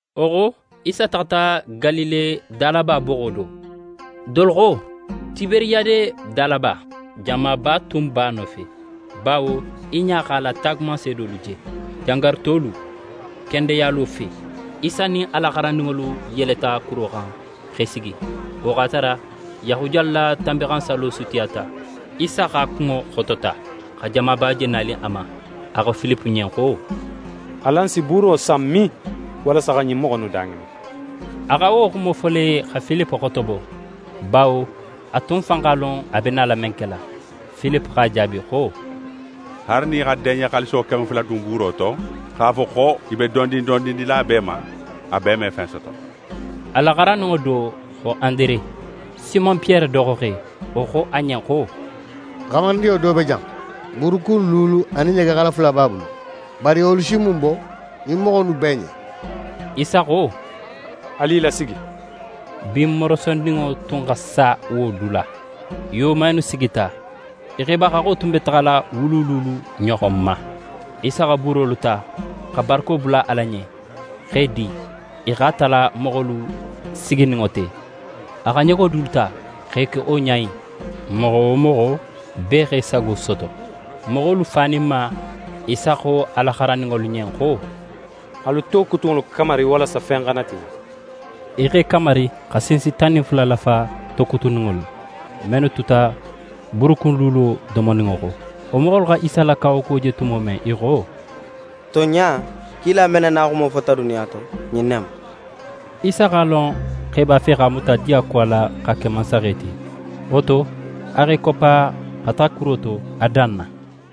Wo xo, Isa taxata Galile dalaba boxo do. Dolu xo Tiberiyade dalaba. Jamaba tun b'a nofe, bawo i ɲa x'a la taagumanseedolu je jangarutolu kendeyalo fe. Isa nin a la xarandinŋolu yeleta kuro xan, x'e sigi. Wo x'a tara Yahudiyalu la Tanbinxansallo sutiyata. Isa x'a kunŋo xotota xa jamaba je nanin a ma. A xo Filipe ɲen xo: «Alan si buuro san min, walasa xa ɲin moxo innu daŋinin?» A xa wo xumo fo le, xa Filipe xotobo, bawo a tun fan x'a lon a be nala men kela. Filipe x'a jaabi xo: «Haali nin í xa deɲe xaaliso keme fula dun buuro to, x'a fo xo í be dondin dondin dila bee ma, a bee me fen soto.» A la xarandinŋo do, xo Andere, Simon Piyere doxoxe, wo xo a ɲen xo: «Xamarindinŋo do be jan, buurukun luulu anin ɲegexala fula b'a bulu. Bari wolu si mun bo ɲin moxo innu bee ɲen?» Isa xo: «Alu i lasigi.» Bin morosoninŋo tun xa sa wo dula. I woman innu sigita. I xeba haxxo tun be taxala wulu luulu ɲoxon ma. Isa xa buurolu ta, xa barako bula Ala ɲen, x'e di, i xa tala moxolu sigininŋo te. A xa ɲego dulu ta x'e ke wo ɲa in. Moxo wo moxo, bee x'é sago soto. Moxolu faninma, Isa xo a la xarandinŋolu ɲen xo: «Alu tokutunŋolu kamari, walasa fen xana tiɲa.» I x'e kamari, xa sinsi tan nin fula lafa tokutunŋolu la, mennu tuta buurukun luulo domoninŋo xo. Wo moxolu xa Isa la kawakuwo je tumo men, i xo: «Tonɲa, kila men na naxumo fota duniya to, ɲin ne mu.» Isa x'a lon xo i b'a fe x'a muta diyakuwa la, x'a ke mansaxe ti. Wo to, a x'é koppa, xa taxa kuro to, a dan na.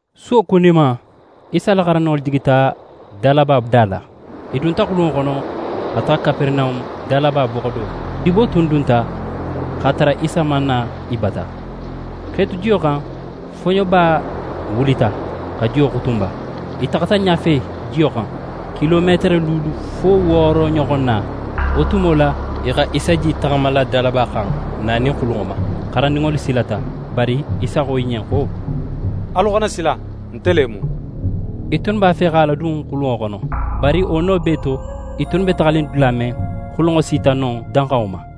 Suwo kuninma, Isa la xarandinŋolu jigita dalaba da la. I dunta xulunŋo xono, xa taxa Kaperenahun dalaba boxo do. Dibo tun dunta x'a tara Isa man na i bata. X'e tu jiyo xan, foɲoba wulita xa jiyo xutunba. I taxata ɲafe jiyo xan, kilometere luulu fo wooro ɲoxon na. Wo tumo la, i xa Isa je í taxamala dalaba xan, nanin xulunŋo ma. Xarandinŋolu silata. Bari Isa xo i ɲen xo: «Alu xana sila! Nte le mu.» I tunnu b'a fe x'a ladun xulunŋo xono. Bari wo no bee to, i tunnu be taxanin dula men, xulunŋo sita non danxanŋo ma.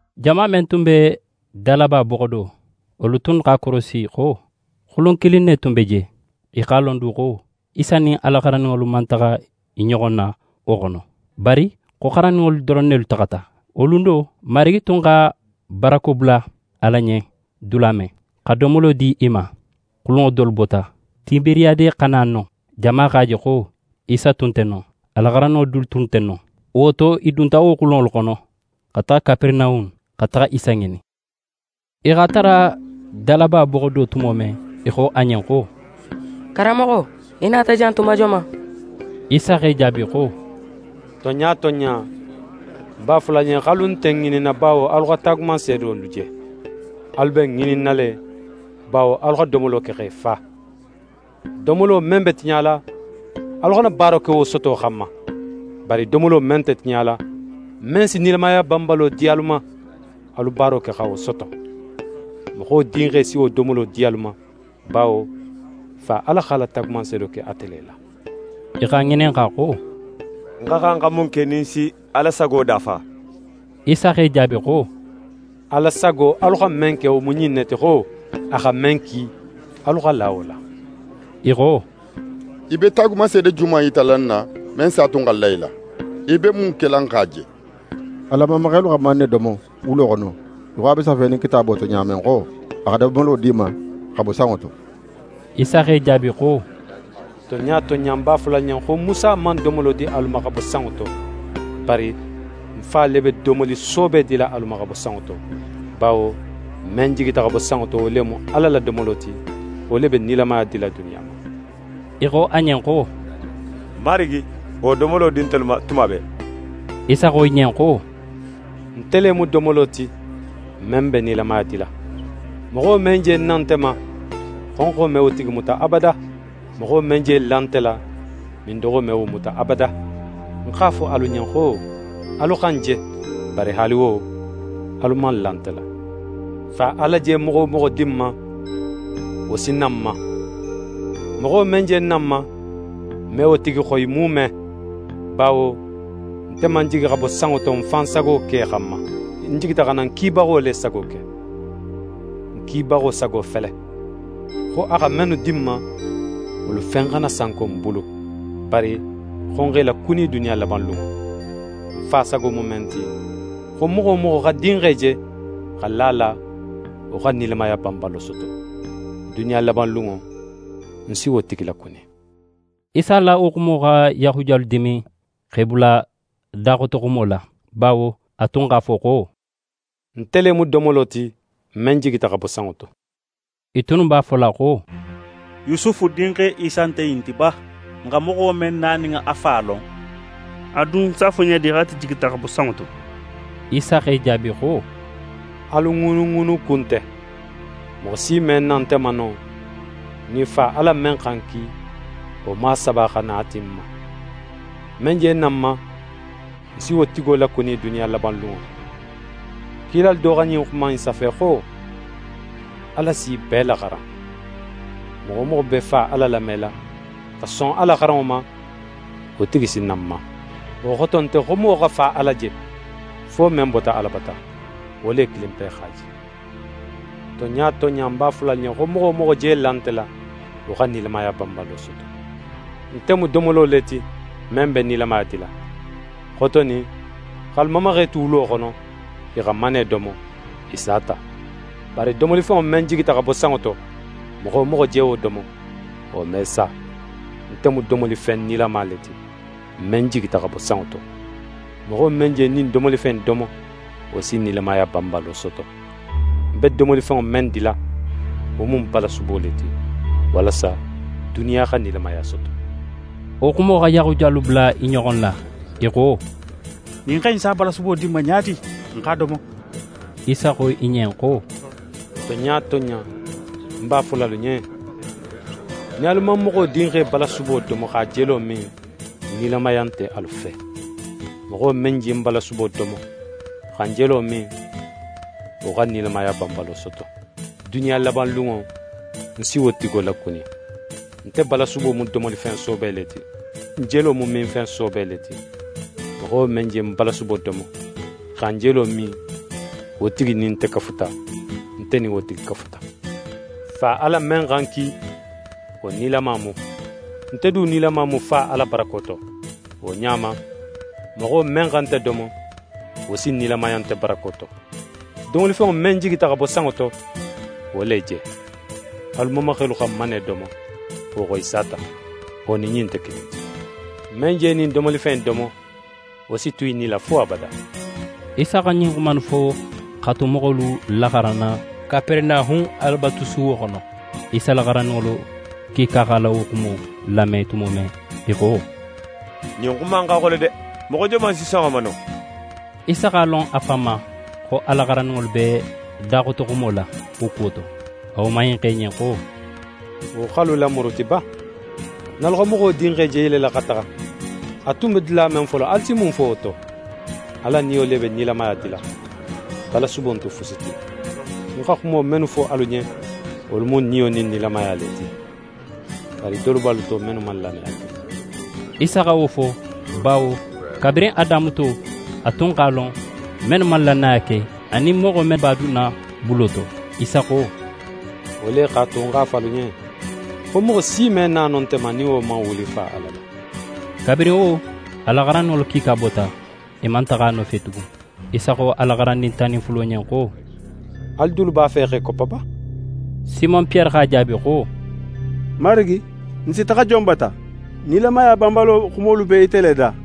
Jama men tun be dalaba boxo do, wolu tunnu x'a korosi xo xulun kilin ne tun be je. I x'a lon du xo Isa nin a la xarandinŋolu man taxa i ɲoxo la wo xono, bari xo xarandinŋolu doron nelu taxata. Wo lun do, Marigi tun xa barako bula Ala ɲen dula men, xa domolo di i ma, xulunŋo dolu bota Tiberiyade xa na non. Jama x'a je xo Isa tun nte non, a la xarandinŋo du tunnu nte non. Wo to, i dunta wo xulunŋolu xono, xa taxa Kaperenahun, xa taxa Isa ŋinin. I x'a tara dalaba boxo do tumo men, i xo a ɲen xo: «Karanmoxo, í nata jan tuma joman?» Isa x'e jaabi xo: «Tonɲa tonɲa, ń b'a fola alu ɲen xo alu nte ń ŋininna bawo alu xa taagumanseedolu je. Alu be ń ŋininna le, bawo alu xa domolo ke x'e fa. Domolo men be tiɲala, alu xana baaro ke wo soto xanma. Bari domolo men nte tiɲala, men si nilamaya banbalo di alu ma, alu baaro ke xa wo soto. Moxo Dinxe si wo domolo di alu ma, bawo Fa Ala x'a la taagumanseedo ke ate le la.» I x'a ŋininxa xo: «N xa xan xa mun ke nin n si Ala sago dafa?» Isa x'e jaabi xo: «Ala sago alu xa men ke, wo mu ɲin ne ti xo: A xa men ki, alu xa la wo la.» I xo: «Í be taagumanseede joman yitala n na, men s'a tu n xa la í la? Í be mun kela n x'a je? Alan mamaxelu xa manne domo wulo xono í xo a be safenin Kitaabo to ɲa men xo: “A xa domolo di i ma xa bo sanŋo to.”» Isa x'e jaabi xo: «Tonɲa tonɲa, ń b'a fola alu ɲen, xo Musa man domolo di alu ma xa bo sanŋo to, bari ń Fa le be domoli soobe dila alu ma xa bo sanŋo to. Bawo men jigita xa bo sanŋo to, wo le mu Ala la domolo ti, wo le be nilamaya dila duniya ma.» I xo a ɲen xo: «Marigi, wo domolo di ntelu ma tuma bee.» Isa xo i ɲen xo: «Nte le mu domolo ti, men be nilamaya dila. Moxo men je na nte ma, xonxo me wo tigi muta abada. Moxo men je la nte la, mindoxo me wo muta abada. Ń x'a fo alu ɲen xo: Alu xa ń je, bari haali wo, alu man la nte la. Fa Ala je moxo wo moxo di ń ma, wo si na ń ma. Moxo men je na ń ma, ń me wo tigi xoyi muume. Bawo nte man jigi xa bo sanŋo to ń fan sago ke xanma. Ń jigita xa na ń kibaxo le sago ke. Ń kibaxo sago fele: Xo a xa mennu di ń ma, wolu fen xana sanko ń bulu, bari xo ń x'e lakuni duniya labanlunŋo. Ń Fa sago mu men ti, xo moxo wo moxo xa Dinxe je, xa la a la, wo xa nilamaya banbalo soto. Duniya labanlunŋo, ń si wo tigi lakuni.» Isa la wo xumo xa Yahudiyalu dimin x'e bula daxotoxumo la, bawo a tun x'a fo xo: «Nte le mu domolo ti, men jigita xa bo sanŋo to». I tunnu b'a fola xo: «Yusufu dinxe Isa nte ɲin ti ba? N xa moxo men na nin a fa lon. A dun s'a fo ɲa di xo ate jigita xa bo sanŋo to?» Isa x'e jaabi xo: «Alu ŋuunuŋuunu ku nte. Moxo si me na nte ma no, nin Fa Ala men xa ń ki, wo man a saba xa na a ti ń ma. Men je na ń ma, ń si wo tigo lakuni duniya labanlunŋo. Kilalu do xa ɲin xuma in safe xo: “Ala s'i bee laxaran.” Moxo wo moxo be Fa Ala lamela, xa son a la xaranŋo ma, wo tigi si na ń ma. Wo xoto nte xo moxo xa Fa Ala je, fo men bota Ala bata. Wo le kilinpe x'a je. Tonɲa tonɲa ń b'a fola alu ɲen, xo moxo wo moxo je la nte la, wo xa nilamaya banbalo soto. Nte mu domolo le ti, men be nilamaya dila. Xotonin x'alu mamaxelu tu wulo xono, i xa manne domo, i sata. Bari domolifenŋo men jigita xa bo sanŋo to, moxo wo moxo je wo domo, wo me sa. Nte mu domolifen nilama le ti, men jigita xa bo sanŋo to. Moxo men je ɲin domolifen in domo, wo si nilamaya banbalo soto. Ń be domolifenŋo men dila, wo mu ń balasubo le ti; walasa duniya xa nilamaya soto.» Wo xumo xa Yahudiyalu bula i ɲoxo la. I xo: «Ɲin xe in s'a balasubo di n ma ɲa di, n x'a domo?» Isa xo i ɲen xo: «Tonɲa tonɲa, ń b'a fola alu ɲen: Nin alu man Moxo Dinxe balasubo domo x'a jelo min, nilamaya nte alu fe. Moxo men je ń balasubo domo, xa ń jelo min, wo xa nilamaya banbalo soto. Duniya labanlunŋo, ń si wo tigo lakuni. Nte balasubo mu domolifen soobe le ti, ń jelo mu minfen soobe le ti. Moxo men je ń balasubo domo, xa ń jelo min, wo tigi nin nte kafuta, nte nin wo tigi kafuta. Fa Ala men xa ń ki, wo nilama mu; nte du nilama mu Fa Ala barako to. Wo ɲa ma, moxo men xa nte domo, wo si nilamaya nte barako to. Domolifenŋo men jigita xa bo sanŋo to, wo le je. Alu mamaxelu xa manne domo, wo xo, i sata. Wo nin ɲin nte kilin ti. Men je ɲin domolifen in domo, wo si tu í nila fo abada.» Isa xa ɲin xuma innu fo x'a tu moxolu laxaranna Kaperenahun Alabatusuwo xono. Isa la xarandinŋolu kiika x'a la wo xumo lame tumo men, i xo: «Ɲin xuma in xa xole de! Moxo joman si son a ma no?» Isa x'a lon a fan ma, xo a la xarandinŋolu be daxotoxumo la wo kuwo to. A woman in xo i ɲen xo: «Wo x'alu lamuruti ba? Nin alu xa Moxo Dinxe je yelela xa taxa, a tun be dula men folo, alu si mun fo wo to? Ala Niyo le be nilamaya dila, balasubo nte fusi ti. Ń xa xumo mennu fo alu ɲen, wolu mu Niyo nin nilamaya le ti. Bari dolu b'alu to mennu man lannaya ke.» Isa xa wo fo, bawo kabirin a damuto, a tun x'a lon mennu man lannaya ke anin moxo men b'a dunna bulo to. Isa xo: «Wo le x'a tu, ń x'a fo alu ɲen, xo moxo si me na no nte ma, nin wo man wuli Fa Ala la.» Kabirin wo, a la xarandinŋolu kiika bota. I man taxa a nofe tugun. Isa xo a la xarandin tan nin fulo ɲen xo: «Alu dulu b'a fe x'e koppa ba?» Simon Piyere x'a jaabi xo: «Marigi, n si taxa jon bata? Nilamaya banbalo xumolu be ite le da.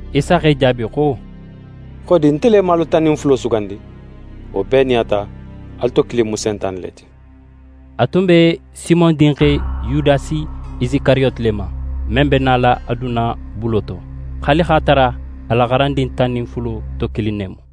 Isa x'e jaabi xo: «Xodi, nte le man alu tan nin fulo sugandi? Wo bee nin a ta, alu to kilin mu Sentane le ti.» A tun be Simon dinxe Yudasi Isikariyoti le ma, men be nala a dunna bulo to. Haali x'a tara a la xarandin tan nin fulo to kilin ne mu.